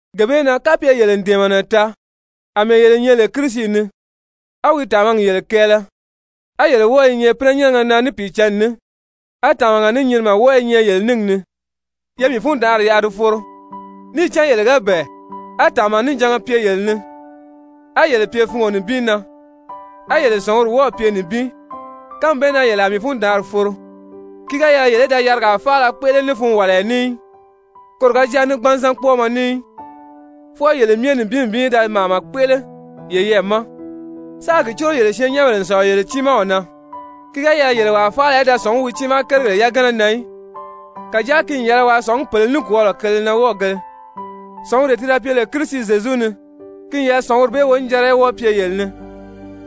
Gee bee na kapye yele n dɛ̀ɛmɛnɛ taa àmɛɛ yele nyɛ lè Kirisi ni, a wi tàmagi yele kɛɛlɛ, a yele wɔ́ɔ i nyɛ pínɛnyɛnnɛgɛ na Pìicǎnni ni, a tàmaga ní nyinimɛ wɔ́ɔ i nyɛ yele níngi ni, ye mii fundaanri yaʔa di foro. Níì cán yele ga bɛ̀ɛ, á tàmanijanga pye yele ni, á yele pye fungo nibin na, á yele sɔ̀nguri wɔ́ɔ̀ pye nibin, kánmi bee na yele a mii fundaanri foro. Ki ga yɛlɛ yele í da yarigaa faala kpéʔele ní funwaliya ní í, koro ga jáa ní gbanzan kpɔ́ɔmɔ ní í, fwɔɔ yele myɛ nibin nibin í da màama kpéʔele yeyɛɛ ma, sáā gi córo yele syɛɛnnyɛnbèle n sɔ̀lɔ yele tiimaw na. Ki ga yɛlɛ yele wàa faala í da sɔ̀ngí wi tiimaa kérigèle yagana na í, kàjáa ki n yɛlɛ waa sɔ̀ngí pèle nikwɔɔlɔ kele na wɔ́ɔgēle. Sɔ̀nguree ti da pye lè Kirisi Zyezu ni, ki n yɛlɛ sɔ̀nguri bee wonijanra í wɔ́ɔ pye yele ni.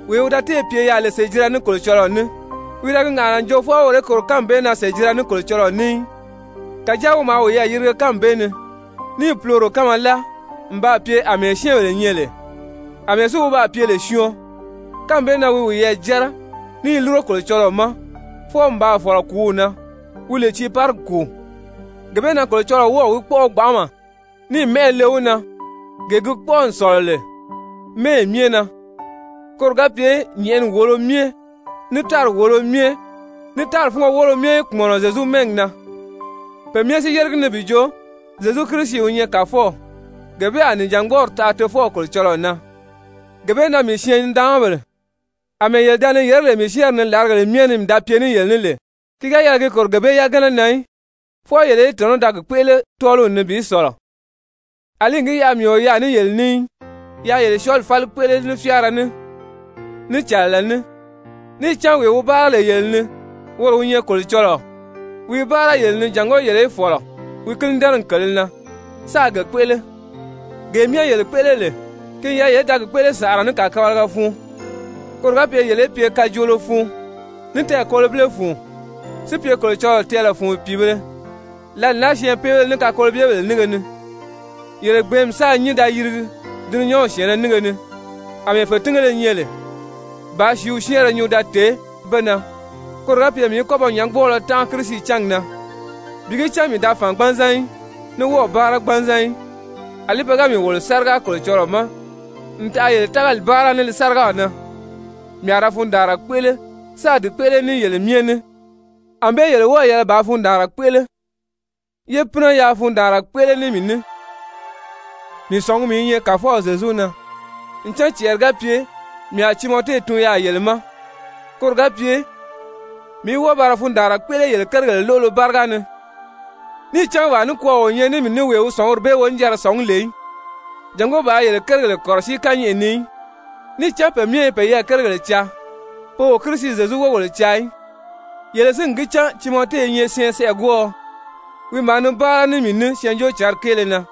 Wee wi da téè pye yaà lè sèjira ní Kolocɔlɔɔ ní, wi da gi ŋàʔana n jo fwɔɔ woro í kòro kánmi bee na sèjira ní Kolocɔlɔɔ ní í. Kàjáa wi maa wiyɛɛ yirige kánmi bee ni, níì puloro kánma láa n baa pye àmɛɛ syɛ́ɛnbèle nyɛ lè. Amɛɛ si wi baa pye lè syɔɔn, kánmi bee na wi wiyɛɛ jɛ́rɛ, ní i lúro Kolocɔlɔɔ ma fwɔɔ n baa fɔ̀lɔ kùúw na, wi lè tiiparigi kùu. Gee bee na Kolocɔlɔɔ wɔ́ɔ̀ wi kpɔ́ʔɔ gbanʔama níì mɛ́ʔɛ le wi na, gee gi kpɔ́ʔɔ n sɔ̀lɔ lè mɛ́ɛyi myɛ na, koro ga pye nyɛ̀ʔɛni wòolo myɛ, ní tári wòolo myɛ, ní tári fúngo woolo myɛ í kpùmɔnɔ Zyezu mɛ́ɛgi na, pe myɛ si yére gi ni bi jo Zyezu Kirisi wi nyɛ Kàfɔw, gee bee a nìjangbɔɔri taʔa Tofɔw Kolocɔlɔɔ na. Gee bee na, mii syɛɛn-nidaanmabèle, àmɛɛ yele da ni yèré lè mii syɛ́ɛnri ni làrigèle myɛ ni mii da pye ní yele ní lè, ki ga yɛlɛ ki kòro gee bee yagana na í, fwɔɔ yele í tɔ̀nɔ́ da gi kpéʔele tɔ́ɔliw ni bi sɔ̀lɔ, àlí n gi yaʔa mii o yaà ní yele ní í, yáā yele syɔɔli fáli kpéʔele ní fyáara, ní cɛ̀lɛlɛ ní. Níì cán wee wi báara lè yele ni woro wi nyɛ Kolocɔlɔɔ, wi i báara yele ni jàngó yele í fɔ̀lɔ wi kínidɛnɛgi kèlē na, sáā ge kpéʔele. Gee myɛ yele kpéʔele lè ki n yɛlɛ yele í da gi kpéʔele sànʔara ní kàkabalaga fun, koro ga pye yele í pye kajoolo fun ní tɛɛkolobile fun, si pye Kolocɔlɔɔ tɛɛlɛ fun pìibēle lǎli naa syɛɛnpeebéle ní kakolobyebèle nínge ni, yele gbɛ̀ɛ́nmi sáā nyín da yirigi dulunyanw syɛ̀ɛnnɛ nínge ni àmɛɛ fètingéle nyɛ lè, bàā sìíw syɛ́ɛnrɛ nyuu da tèé be na, koro ga pye mii í kɔ́ ba nyɔ̌ngbɔɔlɔ tánʔa Kirisi cángi na, bi gi cán mii da fàn gbanzan í, ní wɔ́ɔ̀ báara gbanzan í. Alí pe ga mii wòlo sáriga Kolocɔlɔɔ ma n taʔa yele tágali báara ní li sárigaw na, mii a ra fundaanra kpéʔele sáā di kpéʔele ní yele myɛ ní. Anbée yele wɔ́ɔ̀ yɛlɛ bàā fundaanra kpéʔele, yé pínɛ yaa fundaanra kpéʔele ní mii ní. Mii sɔ̀ngumi i nyɛ Kàfɔw Zyezu na ncan cɛɛri ga pye mii a Timɔte tun yaà yele ma, koro ga pye mii í wɔ́ɔ ba ra fundaanra kpéʔele yele kérigèle lóʔolo báriga ni. Níì cán wàa nikwɔɔ o nyɛ ní mii ní wee wi sɔ̀nguri bee wonijanra sɔ̀ngí lè í, jàngó bàā yele kérigèle kɔ̀rɔsíi kányɛʔɛ ni í. Níì cán pe myɛ i peyɛɛ kérigèle caa, pe o Kirisi Zyezu wógèle caa í. Yele si n gi cán Timɔte i nyɛ syɛɛnsɛʔɛgwɔɔɔ, wi maa ni báara ní mii ní Syɛɛnjóocǎnri kéele na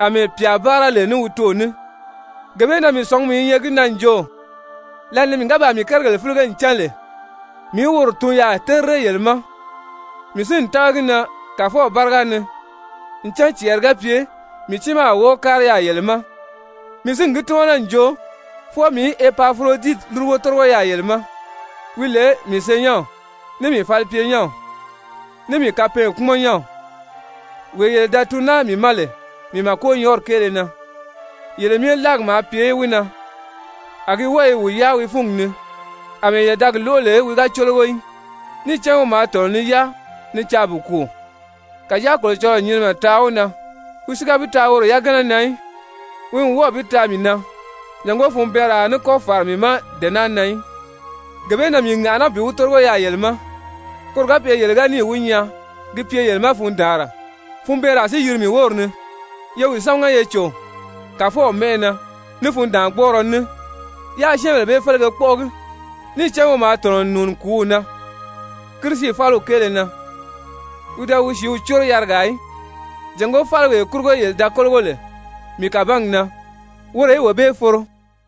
àmɛɛ pyà báara lè ní wi toò ní. Gee bee na mii sɔ̀ngumi i nyɛ gi na n jo, lǎli ni mii ga baa mii kérigèle fílige n cán lè, mii í woro tun yaà terire yele ma. Mii si n tága gi na Kàfɔw báriga ni, ncan cɛɛri ga pye mii tiimaa a wɔ́ɔ kári yaà yele ma. Mii si n gi tímana n jo, fwɔɔ mii í Epafuroditi lúrugo tórigo yaà yele ma, wi lè mii senyɛnw, ní mii falipyenyɛnw, ní mii kapɛɛnkpumɔnnyɛnw, wee yele da tun naa mii ma lè mii màkonyɔɔri kéele na. Yele myɛ láagi maa pye wi na, a gi wɔ́ɔ i wi yáa wi fúngi ni àmɛɛ yele da gi lóʔo lè wi ga cólogo í. Níì cán wi maa tɔ̀nɔ ni yáa ni caa bi kùu. Kàjáa Kolocɔlɔɔ n nyinimɛ taa wi na, wi si ga bi taa woro yagana na í, wi n wɔ́ɔ̀ bi taa mii na, jàngó funbɛɛnraa a ní kɔ́ fàra mii ma dee naa na í. Gee bee na mii ŋàʔaná bi wi tórigo yaà yele ma, koro ga pye yele ga níì wi nyaa ki pye yele ma fundaanra, funbɛɛnraa si yiri mii wóri ni. Ye wi sámaga ye cò Kàfɔw mɛ́ʔɛ na ní fundaangbɔɔrɔ ní, yáā syɛ́ɛnbèle bee félege kpɔ́ʔɔgi. Níì cán wi maa tɔ̀nɔ n nùuni kùúw na Kirisi fáliw kéele na, wi da wi sìíw córo yarigaa í, jàngó fáliwee kurugo yele da kólogo lè mii kàbangi na, woro í wee bee foro.